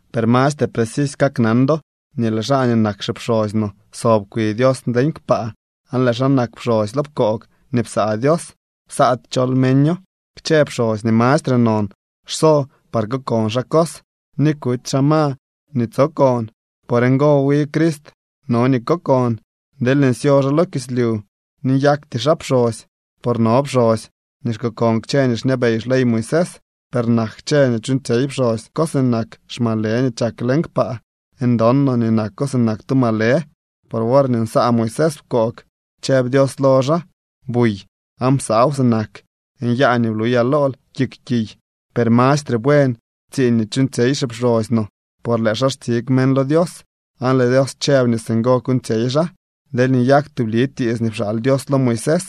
Per mastre precisy kaknan do nii lëë xaa nii nak xipxosy no sob kwi Dios leñ kpaa, aan lëë xaa nak pxosy lo pkoog nii psaa Dios. Psaady chol meño. Kchë pxosy nii mastre non xso par kokon xaa cos, ni kuty xaa ma nii tsokon. Por ngo, wi Crist no nii kokon. Deelñee nsyo xaa lo kislyu, ni nyakty xaa pxosy, por no pxosy nii xkokon kchë nii xñabey xley Moisés. Per nak kchë nii chuuñtsyey pxosy ko sinak xmalë nii chak leñ kpaa. Ndon no nii nako sinak tu malë, por worñee nsaa Moisés pkoog, chëb Dios lo xaa: “Buy, aan psaaw sinak nyaa nii bluyaa lool kik kiy.” Per mastre buen tsiiñ nii chuuñtsyey xipxosy no, por lëë xaa xtsig meñ lo Dios, aan lëë Dios chëb nii singo kuuñtsyey xaa. Deelñee nyak tubli tiits nii pxaal Dios lo Moisés,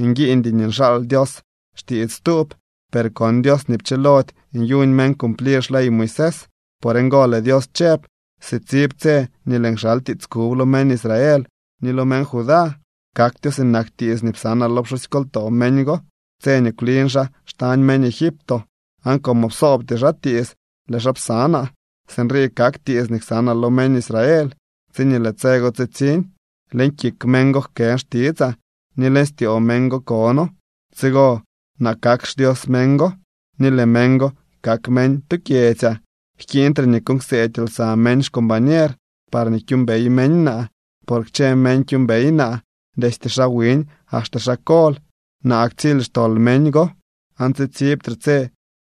nguiiñdy nii nxaal Dios xtiits stub. Per kon Dios nii pchilody nyuñ meñ cumplir xley Moisés. Por ngo lëë Dios chëb: Sitsib tse nii lëën kxal tiits kub lo meñ Israel ni lo meñ Judá. Kaktyo sinak tiits nii psanaa lo pxosykoltoo meñ go, tse nii kwlin xaa xtañ meñ Egipto. Aan como psoobty xaa tiits, lëë xaa psanaa. Sinrii kak tiits nii ksanaa lo meñ Israel tsiñee lëë tse go tsitsiñ: Leñ kik meñ go jkën xtitsaa, ni leñ styoo meñ go kono. Tsigo naa kak xDios meñ go, ni lëë meñ go kak meñ tu kyedzyaa. Jkiiñtre nii kuuñ kseedy lsa meñ xcombañer, parñee kyuumbey meñ naa, por kchë meñ kyuumbey naa, destye xaa wiñ axte xaa kol. Naa ktsily xtol meñ go aan tsitsibtre tse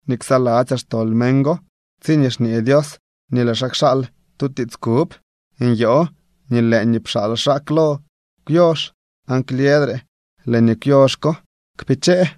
nii ksaladzyaa xtol meñ go. Tsiñee xñee Dios nii lëë xaa kxaal tu tiits kub, nyoo nii lëë nii pxaal xaa klo kwyox, aan klyëëdre lëë nii kwyox ko kpichee.